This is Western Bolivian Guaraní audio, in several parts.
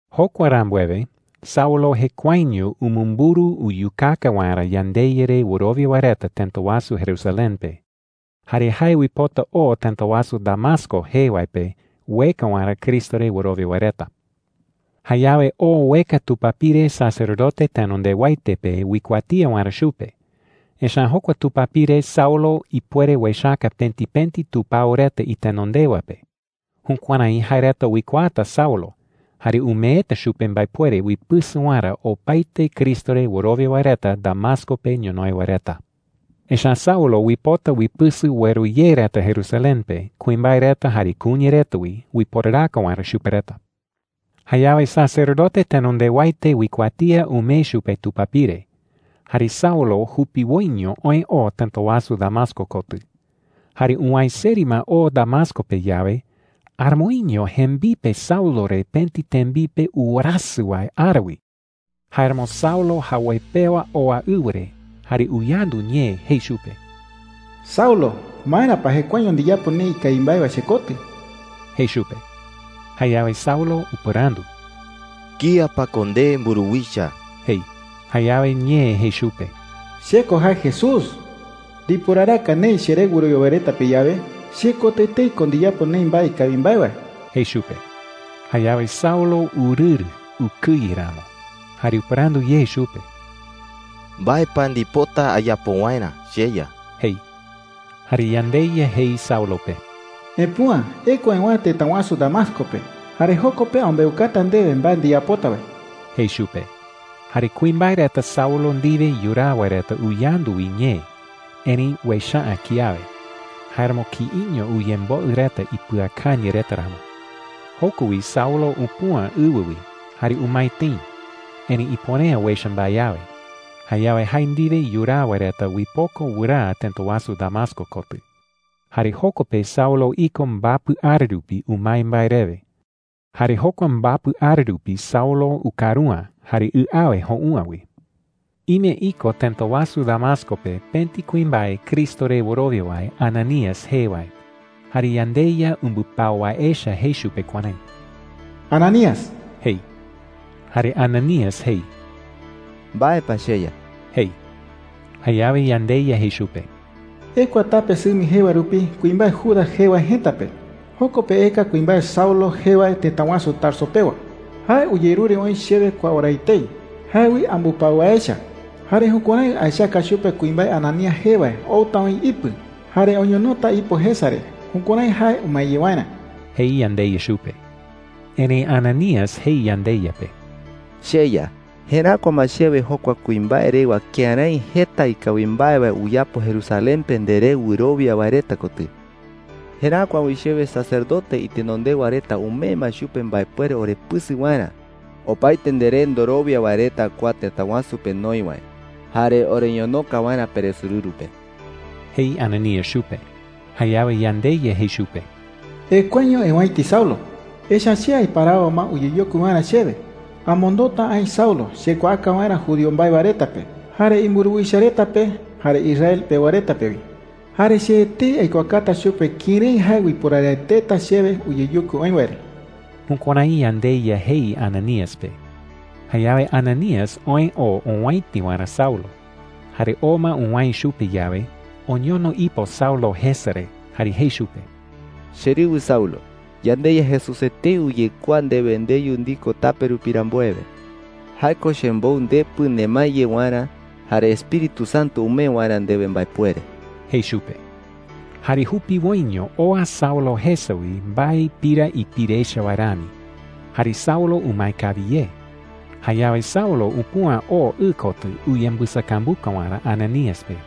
Jokua rambuewe, Saulo jekuaeño umumburu uyukaka waerä yandeYa re wɨrowia wae reta tëta wasu Jerusalén pe. Jare jae uipota oo tëta wasu Damasco jee wae pe ueka waerä Cristo re wɨrowia wae reta. Jayawe oo ueka tupapire sacerdote tenondewaete pe uikuatía waerä chupe. Echa’ä jokua tupapire Saulo ipuere uechaka pëti pëti tupao reta itenondewa pe. Jukuärái jae reta uikuaata Saulo, jare umeeta chupe mbaepuere uipɨsɨ waerä opaete Cristo re wɨrowia wae reta Damasco pe ñonoï wae reta. Echa’ä Saulo uipota uipɨsɨ ueru ye reta Jerusalén pe – kuimbae reta jare kuña reta wi – uiporaraka waerä chupe reta. Jayawe sacerdote tenondewaete uikuatía umee chupe tupapire. Jare Saulo jupiwoiño oë oo tëta wasu Damasco kotɨ. Jare uwäe seri ma oo Damasco pe yawe, aramoiño jembipe Saulo re pëti tembipe uwerasɨ wae ara wi. Jáeramo Saulo jawoi pewa oa ɨwɨ re, jare uyandu ñee jei chupe: “Saulo, ¿maera pa jekuaeño ndiyapo neï ikawi mbae wae chekotɨ?” jei chupe. Jayawe Saulo upɨrandu: “¿Kía pa ko nde, mburuwicha?” jei. Jayawe ñee jei chupe: “Che ko jae Jesús,” jei. “Ndiporaraka neï cheré wɨrowia wae reta pe yawe, chekotɨ etei ko ndiyapo neï mbae ikawi mbae wae,” jei chupe. Jayawe Saulo urɨrɨ ukɨye ramo, jare upɨrandu ye chupe: “¿Mbae pa ndipota ayapo waerä, cheYa?” jei. Jare yandeYa jei Saulo pe: “Epüa ekua ewäe tëta wasu Damasco pe, jare joko pe ambeukata ndewe mbae ndiyapota wae,” jei chupe. Jare kuimbae reta Saulo ndiwe yuraa wae reta uyandu wi ñee, erëi uecha’ä kiawe. Jáeramo kïiño uyemboɨ reta ipɨakañɨ reta ramo. Joko wi Saulo upüa ɨwɨ wi jare umae tëi, erëi ipuere’ä uecha mbae awe. Jayawe jae ndiwe yuraa wae reta uipoko wɨraa tëta wasu Damasco kotɨ. Jare joko pe Saulo iko mbapɨ ara rupi umae mbae rewe. Jare jokua mbapɨ ara rupi Saulo ukaru’ä jare ɨ awe jou’ä wi. Ime iko tëta wasu Damasco pe pëti kuimbae Cristo re wɨrowia wae Ananías jee wae. Jare yandeYa umbɨpau wae echa jei chupe kuärái: “Ananías,” jei. Jare Ananías jei: “¿Mbae pa, cheYa?” jei. Jayawe yandeYa jei chupe: “Ekua tape Sɨmi jee wae rupi kuimbae Judas jee wae jëta pe. Joko pe eka kuimbae Saulo jee wae tëta wasu Tarso pewa,” jei. “Jae uyerure oï chewe kua ora etei. Jae wi ambɨpau wae echa. Jare jukuärái aechaka chupe kuimbae Ananías jee wae outa oï ipɨ jare oñonota ipo jesa re jukuärái jae umae ye waerä,” jei yandeYa chupe. Erëi Ananías jei yandeYa pe: “CheYa, jeräkua ma chewe jokua kuimbae rewa kërái jeta ikawi mbae wae uyapo Jerusalén pe nderé wɨrowia wae reta kotɨ,” jei. “Jeräkua wi chewe sacerdote itenondewa reta umee ma chupe mbaepuere orepɨsɨ waerä, opaete nderé ndorowia wae reta kua tëta wasu pe noï wae, jare oreñonoka waerä peresorɨru pe,” jei Ananías chupe. Jayawe yandeYa jei chupe: “Ekuaño eowäiti Saulo,” jei. “Echa’ä che aiparawo ma uyeyokui waerä chewe. Amondota aï Saulo chekuaaka waerä judío mbae wae reta pe, jare imburuwicha reta pe, jare Israel iñemoñaa reta pe wi. Jare che etei aikuaakata chupe kërái jae uiporaraeteta chewe uyeyokui oï wae re.” Jukuärái yandeYa jei Ananías pe. Jayawe Ananías oë oo owäiti waerä Saulo. Jare oo ma uwäe chupe yawe, oñono ipo Saulo jesa re jare jei chupe: “Cherɨwɨ Saulo, yandeYa Jesús etei uyekuaa ndewe ndeyu ndiko tape rupi rambuewe,” jei. “Jae ko chembou ndepɨ nemae ye waerä jare Espíritu Santo umee waerä ndewe mbaepuere,” jei chupe. Jare jupiwoiño oa Saulo jesa wi mbae pira ipire echa wae rami, jare Saulo umae kawi ye. Jayawe Saulo upüa oo ɨ kotɨ uyembɨsakambuka waerä Ananías pe.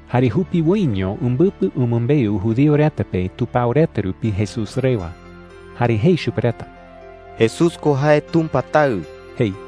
Jare jupiwoiño umbɨpɨ umɨmbeu judío reta pe tupao reta rupi Jesús rewa. Jare jei chupe reta: “Jesús ko jae Tumpa Taɨ,” jei.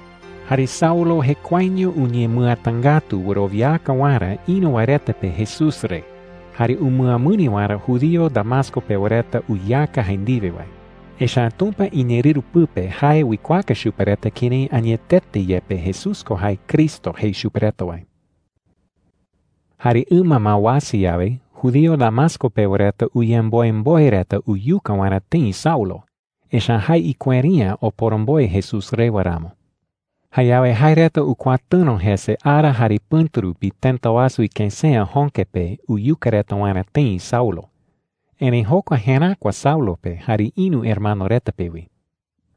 Jare Saulo jekuaeño uñemɨatangätu wɨrowiaka waerä ïru wae reta pe Jesús re jare umɨamɨri waerä judío Damasco pewa reta uyeaka jae ndiwe wae. Echa’ä Tumpa iñeerɨru pɨpe jae uikuaaka chupe reta kërái añetete yepe Jesús ko jae Cristo jei chupe reta wae. Jare ɨma ma uasa yawe, judío Damasco pewa reta uyemboemboe reta uyuka waerä tëi Saulo, echa’ä jae ikueri’ä oporomboe Jesús rewa ramo. Jayawe jae reta ukuatɨ̈ro jese ara jare pɨ̈tu rupi tëta wasu ikësea jöke pe uyuka reta waerä tëi Saulo. Erëi jokua jeräkua Saulo pe jare ïru hermano reta pe wi.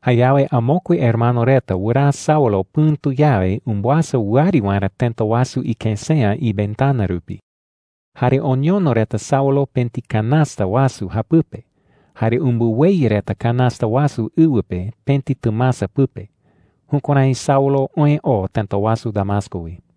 Jayawe amokue hermano reta wɨraa Saulo pɨ̈tu yawe umbɨasa wɨari waerä tëta wasu ikësea iventana rupi. Jare oñono reta Saulo pëti canasta wasu japɨpe jare umbɨweyɨ reta canasta wasu ɨwɨ pe pëti tɨmasa pɨpe. Jukuärái Saulo oë oo tëta wasu Damasco wi.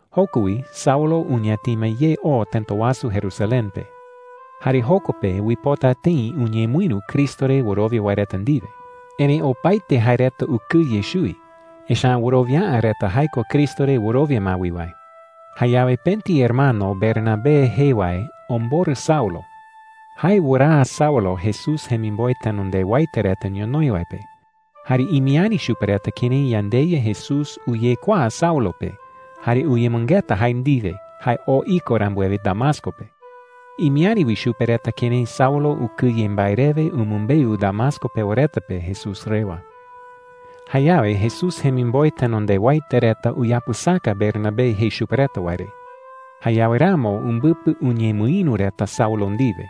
Joko wi Saulo uñatima ye oo tëta wasu Jerusalén pe. Jare joko pe uipota tëi uñemɨïru Cristo re wɨrowia wae reta ndiwe. Erëi opaete jae reta ukɨye chuwi, echa’ä wɨrowia’ä reta jae ko Cristo re wɨrowia ma wi wae. Jayawe pëti hermano Bernabé jee wae omborɨ Saulo. Jae wɨraa Saulo Jesús jemimboe tenondewaete reta ñonoï wae pe. Jare imiäri chupe reta kërái yandeYa Jesús uyekuaa Saulo pe jare uyemɨngeta jae ndiwe jae oo iko rambuewe Damasco pe. Imiäri wi chupe reta kërái Saulo ukɨye mbae rewe umɨmbeu Damasco pewa reta pe Jesús rewa. Jayawe Jesús jemimboe tenondewaete reta uyapɨsaka Bernabé jei chupe reta wae re. Jayawe ramo umbɨpɨ uñemɨïru reta Saulo ndiwe.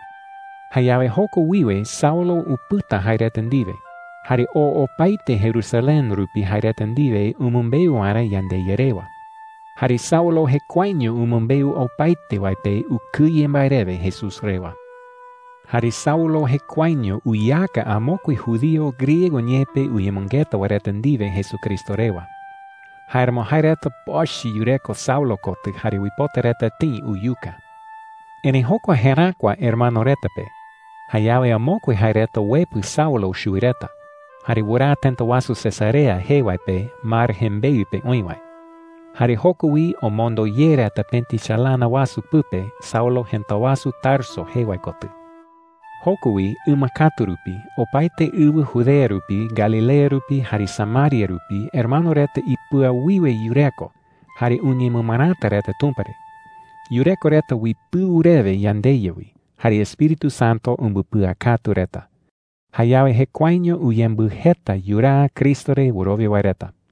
Jayawe joko wiwe Saulo upɨta jae reta ndiwe, jare oo opaete Jerusalén rupi jae reta ndiwe umɨmbeu waerä yandeYa rewa. Jare Saulo jekuaeño umɨmbeu opaete wae pe ukɨye mbae rewe Jesús rewa. Jare Saulo jekuaeño uyeaka amokue judío griego ñee pe uyemɨngeta wae reta ndiwe Jesucristo rewa. Jáeramo jae reta pochɨ yureko Saulo kotɨ jare uipota reta tëi uyuka. Erëi jokua jeräkua hermano reta pe. Jayawe amokue jae reta uepɨ Saulo chuwi reta, jare wɨraa tëta wasu Cesarea jee wae pe mar jembeɨ pe oï wae. Jare joko wi omondo ye reta pëti chalana wasu pɨpe Saulo jëta wasu Tarso jee wae kotɨ. Joko wi ɨma katu rupi opaete ɨwɨ Judea rupi, Galilea rupi, jare Samaria rupi hermano reta ipɨawiwe yureko jare uñemɨmɨräta reta Tumpa re. Yureko reta uipɨu rewe yandeYa wi, jare Espíritu Santo umbɨpɨakatu reta. Jayawe jekuaeño uyembɨjeta yuraa Cristo re wɨrowia wae reta.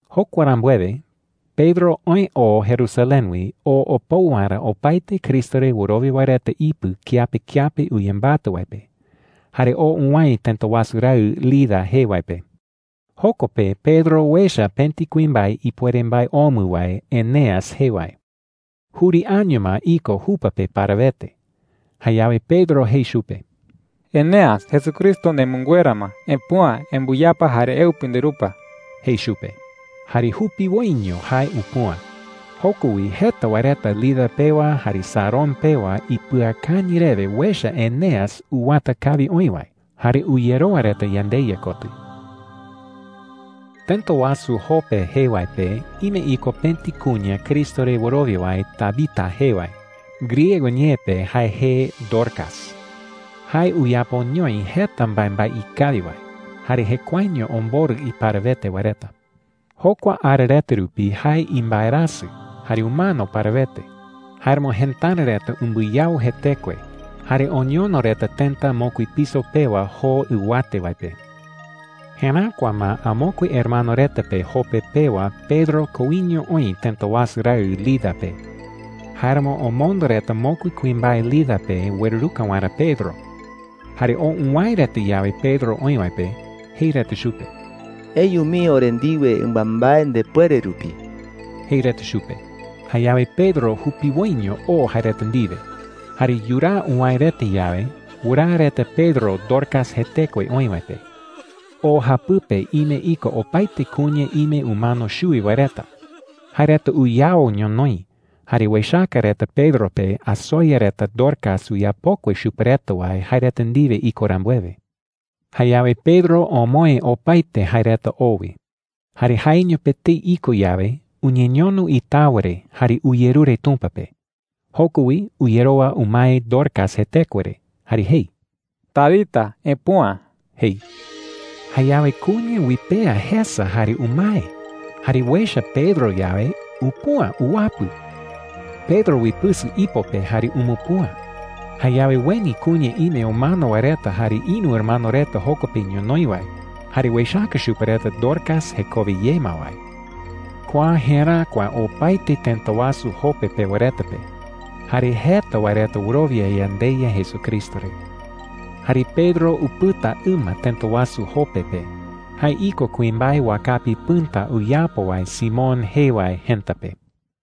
Jokua rambuewe, Pedro oë oo Jerusalén wi oo opou waerä opaete Cristo re wɨrowia wae reta ipɨ kiape kiape uyembatɨ wae pe. Jare oo uwäe tëta wasu raɨ Lida jee wae pe. Joko pe Pedro uecha pëti kuimbae ipuere mbae omɨ wae Eneas jee wae. Juri año ma iko jupa pe parawete. Jayawe Pedro jei chupe: “Eneas, Jesucristo nemɨnguera ma. Epüa, embɨyapa jare eupi nderupa,” jei chupe. Jare jupiwoiño jae upüa. Joko wi jeta wae reta Lida pewa jare Sarón pewa ipɨakañɨ rewe uecha Eneas uwata kawi oï wae, jare uyerowa reta yandeYa kotɨ. Tëta wasu Jope jee wae pe ime iko pëti kuña Cristo re wɨrowia wae Tabita jee wae. Griego ñee pe jae jee Dorcas. Jae uyapoñoi jeta mbaembae ikawi wae, jare jekuaeño omborɨ iparawete wae reta. Jokua ara reta rupi jae imbaerasɨ jare umano parawete. Jáeramo jëtara reta umbɨyau jetekue jare oñono reta tëta mokui piso pewa joo ɨwate wae pe. Jeräkua ma amokue hermano reta pe Jope pewa Pedro koiño oï tëta wasu raɨ Lida pe. Jáeramo omondo reta mokui kuimbae Lida pe ueruruka waerä Pedro. Jare oo uwäe reta yawe Pedro oï wae pe, jei reta chupe: “Eyu mii ore ndiwe ɨmambae ndepuere rupi,” jei reta chupe. Jayawe Pedro jupiwoiño oo jae reta ndiwe. Jare yuraa uwäe reta yawe, wɨraa reta Pedro Dorcas jetekue oï wae pe. O japɨpe ime iko opaete kuña ime umano chuwi wae reta. Jae reta uyao ñonoï, jare uechaka reta Pedro pe asoya reta Dorcas uyapokue chupe reta wae jae reta ndiwe iko rambuewe. Jayawe Pedro omoë opaete jae reta o wi. Jare jaeño pe etei iko yawe, uñeñono itawa re jare uyerure Tumpa pe. Joko wi uyerowa umae Dorcas jetekue re jare jei: “¡Tabita, epüa!” jei. Jayawe kuña uipea jesa jare umae. Jare uecha Pedro yawe, upüa uwapɨ. Pedro uipɨsɨ ipo pe jare umupüa. Jayawe ueni kuña ime umano wae reta jare ïru hermano reta joko pe ñonoï wae, jare uechaka chupe reta Dorcas jekowe ye ma wae. Kua jeräkua opaete tëta wasu Jope pewa reta pe. Jare jeta wae reta wɨrowia yandeYa Jesucristo re. Jare Pedro upɨta ɨma tëta wasu Jope pe. Jae iko kuimbae wakapi pɨ̈ta uyapo wae Simón jee wae jëta pe.